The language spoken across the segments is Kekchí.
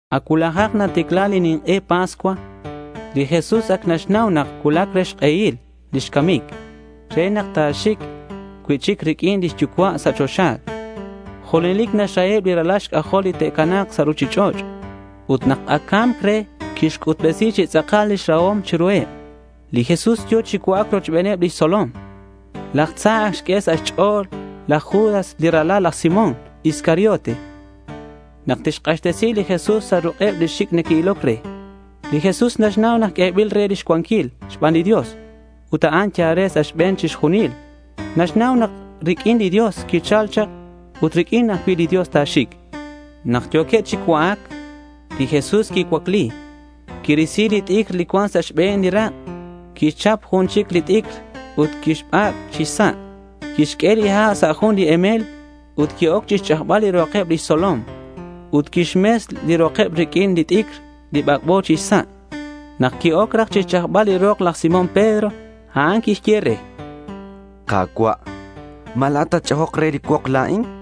Ac cuulajak naticla li nink'e Pascua. Li Jesús ac naxnau nak cuulac re xk'ehil lix camic re nak ta̱xic cui'chic riq'uin lix Yucua' sa' choxa. Junelic naxraheb li ralal xc'ajol li te'cana̱k sa' ruchich'och' ut nak ac ca̱mc re quixc'utbesi chi tz'akal lix rahom chiruheb. Li Jesús yo̱ chi cua'ac rochbeneb lix tzolom. Laj tza ac xq'ue sa' xch'o̱l laj Judas li ralal laj Simón Iscariote nak tixk'axtesi li Jesús sa' ruk'eb li xic' neque'iloc re. Li Jesús naxnau nak q'uebil re lix cuanquil xban li Dios ut a'an yal re sa' xbe̱n chixjunil. Naxnau nak riq'uin li Dios quichal chak ut riq'uin ajcui' li Dios ta̱xic. Nak yo̱queb chi cua'ac, li Jesús quicuacli. Quirisi lix t'icr li cuan sa' xbe̱n li rak'. Quixchap jun chic li t'icr ut quixbac' chi xsa'. Quixq'ue li ha' sa' jun li emel ut qui-oc chixch'ajbal li rokeb lix tzolom. Ut quixmes li rokeb riq'uin li t'icr bac'bo chi xsa'. Nak qui-oc raj chixch'ajbal li rok laj Simón Pedro, a'an quixye re: —Ka̱cua', ¿ma la̱at tatch'ajok re li cuok la̱in? chan.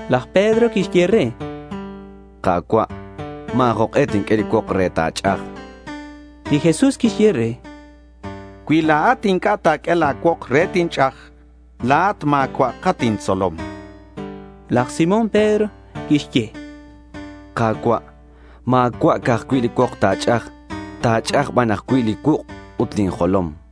Laj Pedro quixye re: —Ka̱cua', ma̱ jok'e tinq'ue li cuok re ta̱ch'aj, chan. Li Jesús quixye re: —Cui la̱at inc'a' ta̱q'ue la̱ cuok re tinch'aj, la̱at ma̱cua'at intzolom, chan. Laj Simón Pedro quixye: —Ka̱cua', ma̱cua' ca'aj cui' li cuok ta̱ch'aj. Ta̱ch'aj aj ban cui' li cuuk' ut lin jolom, chan.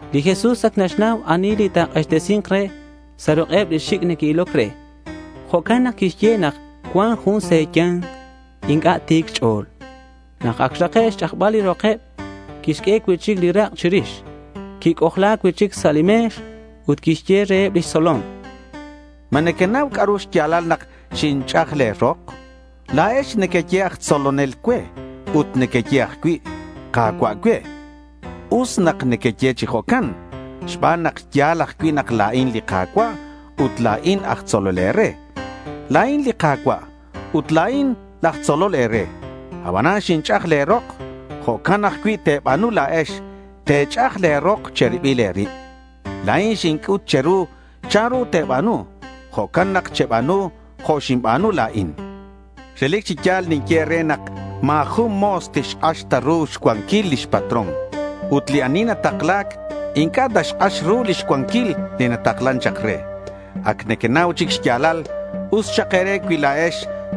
Li Jesús ac naxnau ani li ta̱k'axtesi̱nk re sa' ruk'eb li xic' neque'iloc re. Jo'can nak quixye nak cuan jun sa' xya̱nkeb inc'a' ti̱c xch'o̱l. Nak ac xrake' xch'ajbal li rokeb, quixq'ue cui'chic li rak' chirix. Quic'ojla cui'chic sa' li me̱x. Ut quixye reheb lix tzolom: —¿Ma nequenau c'a'ru xya̱lal nak xinch'aj le̱ rok? chan reheb. —La̱ex nequeye aj tzolonel cue ut nequeye ajcui' Ka̱cua' cue. Us nak nequeye chi jo'can xban nak ya̱l ajcui' nak la̱in li Ka̱cua' ut la̱in aj tzolol e̱re. La̱in li Ka̱cua' ut la̱in laj tzolol e̱re. Abanan xinch'aj le̱ rok. Jo'can ajcui' te̱ba̱nu la̱ex. Te̱ch'aj le̱ rok che̱ribil e̱rib. La̱in xinc'ut che̱ru chanru te̱ba̱nu. Jo'can nak cheba̱nu jo' xinba̱nu la̱in. Relic chi ya̱l ninye e̱re nak ma̱ jun mo̱s tixk'ax ta ru xcuanquil lix patrón ut li ani natakla̱c inc'a' naxk'ax ru lix cuanquil li quitaklan chak re. Ac nequenau chic xya̱lal. Us xak e̱re cui la̱ex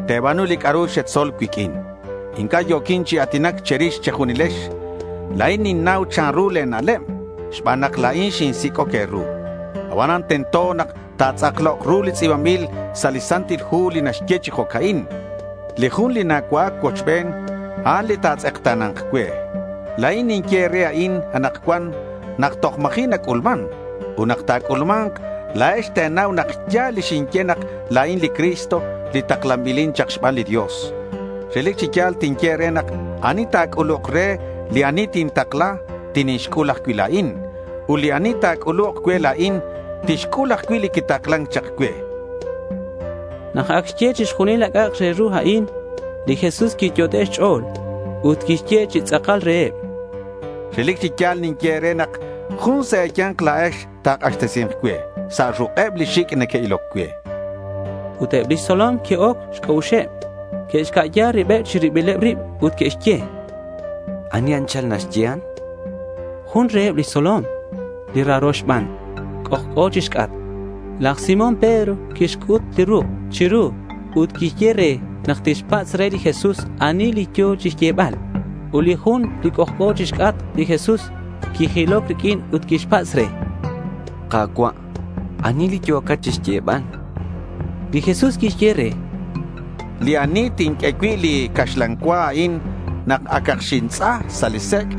te̱ba̱nu li c'a'ru xetzol cuiq'uin. Inc'a' yo̱quin chi a̱tinac che̱rix che̱junilex. La̱in ninnau chanru le̱ na'leb xban nak la̱in xinsic'oc e̱ru. Abanan tento nak ta̱tz'aklok ru li tz'i̱banbil sa' li Santil Hu li naxye chi jo'ca'in: Li jun li nacua'ac cuochben, a'an li ta̱tz'ekta̱na̱nk cue. La̱in ninye e̱re a'in anakcuan nak toj ma̱ji' nac'ulman. Ut nak ta̱c'ulma̱nk, la̱ex te̱nau nak ya̱l li xinye nak la̱in li Cristo li taklanbil chak xban li Dios. Relic chi ya̱l tinye e̱re nak ani ta̱c'uluk re li ani tintakla, tinixc'ul ajcui' la̱in. Ut li ani ta̱c'uluk cue la̱in, tixc'ul ajcui' li quitaklan chak cue, chan li Jesús reheb. Nak ac xye chixjunil li c'a'ak re ru a'in, li Jesús quiyot'e' xch'o̱l. Ut quixye chi tz'akal reheb: —Relic chi ya̱l ninye e̱re nak jun sa' e̱ya̱nk la̱ex ta̱k'axtesi̱nk cue sa' ruk'eb li xic' neque'iloc cue, chan. Ut eb lix tzolom que'oc xc'a'uxeb. Que'xca'ya ribeb chi ribileb rib ut que'xye: —¿Ani anchal naxyehan? chanqueb. Jun reheb lix tzolom, li raro xban, c'ojc'o chixc'atk. Laj Simón Pedro quixc'ut li ruk' chiru ut quixye re nak tixpatz' re li Jesús ani li yo̱ chixyebal. Ut li jun, li c'ojc'o chixc'atk li Jesús, quijiloc riq'uin ut quixpatz' re: —Ka̱cua', ¿ani li yo̱cat chixyebal? chan. Li Jesús quixye re: —Li ani tinq'ue cui' li caxlan cua a'in nak acak xintz'a sa' li sec',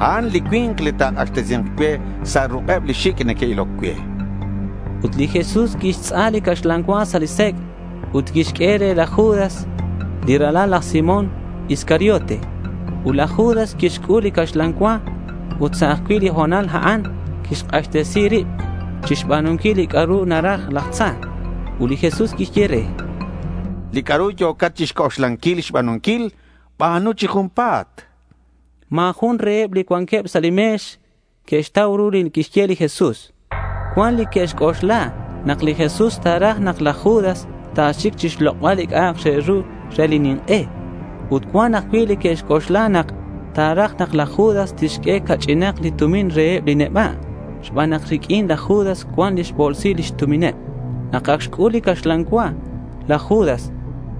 a'an li cui̱nk li ta̱k'axtesi̱nk cue sa' ruk'eb li xic' neque'iloc cue, chan. Ut li Jesús quixtz'a li caxlan cua sa' li sec' ut quixq'ue re laj Judas li ralal laj Simón Iscariote. Ut laj Judas quixc'ul li caxlan cua ut sa' ajcui' li ho̱nal a'an quixk'axtesi rib chixba̱nunquil li c'a'ru naraj laj tza. Ut li Jesús quixye re: —Li c'a'ru yo̱cat chixc'oxlanquil xba̱nunquil, ba̱nu chi junpa̱t, chan. Ma̱ jun reheb li cuanqueb sa' li me̱x que'xtau ru li quixye li Jesús. Cuan li que'xc'oxla nak li Jesús ta̱raj nak laj Judas ta̱xic chixlok'bal li c'a'ak re ru re li nink'e. Ut cuan ajcui' li que'xc'oxla nak ta̱raj nak laj Judas tixq'ue ca'ch'inak li tumin reheb li neba' xban nak riq'uin laj Judas cuan lix bo̱lsil lix tumineb. Nak ac xc'ul li caxlan cua laj Judas,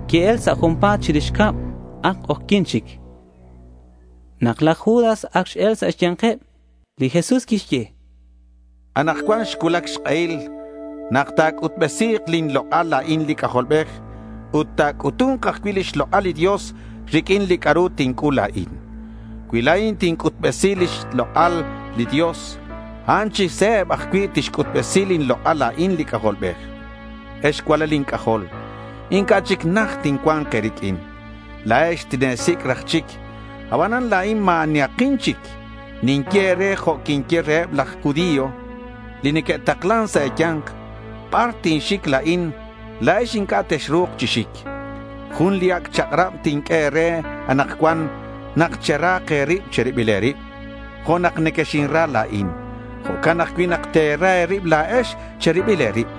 qui-el sa' junpa̱t chirix cab. Ac k'ojyi̱n chic. Nak laj Judas ac x-el sa' xya̱nkeb, li Jesús quixye: —Anakcuan xcuulac xk'ehil nak ta̱c'utbesi̱k lin lok'al la̱in li C'ajolbej ut ta̱c'utu̱nk ajcui' lix lok'al li Dios riq'uin li c'a'ru tinc'ul la̱in. Cui la̱in tinc'utbesi lix lok'al li Dios, a'an chi se̱b ajcui' tixc'utbesi lin lok'al la̱in li C'ajolbej. Ex cualal inc'ajol, inc'a' chic najt tincua̱nk e̱riq'uin. La̱ex tine̱sic' raj chic. Abanan la̱in ma̱ anihakin chic. Ninye e̱re jo' quinye reheb laj judío li neque'taklan sa' e̱ya̱nk. Bar tinxic la̱in, la̱ex inc'a' texru̱k chi xic. Jun li ac' chak'rab tinq'ue e̱re anakcuan nak cherahak e̱rib che̱ribil e̱rib. Jo' nak nequexinra la̱in, jo'can ajcui' nak te̱ra e̱rib la̱ex che̱ribil e̱rib.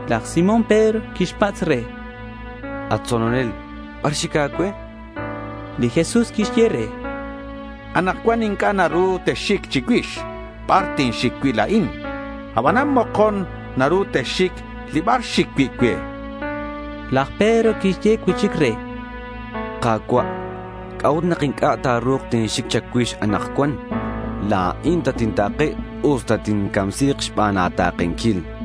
Laj Simón Pedro quixpatz' re: —At tzolonel, ¿bar xic a̱cue?— Li Jesús quixye re: —Anakcuan inc'a' naru texxic chicuix bar tinxic cui' la̱in. Abanan mokon naru texxic li bar xic cui' cue, chan. Laj Pedro quixye cui'chic re: —Ka̱cua', ¿c'a'ut nak inc'a' ta̱ru̱k tinxic cha̱cuix anakcuan? La̱in tatinta̱ke usta tincamsi̱k xban a̱ta̱kenquil, chan.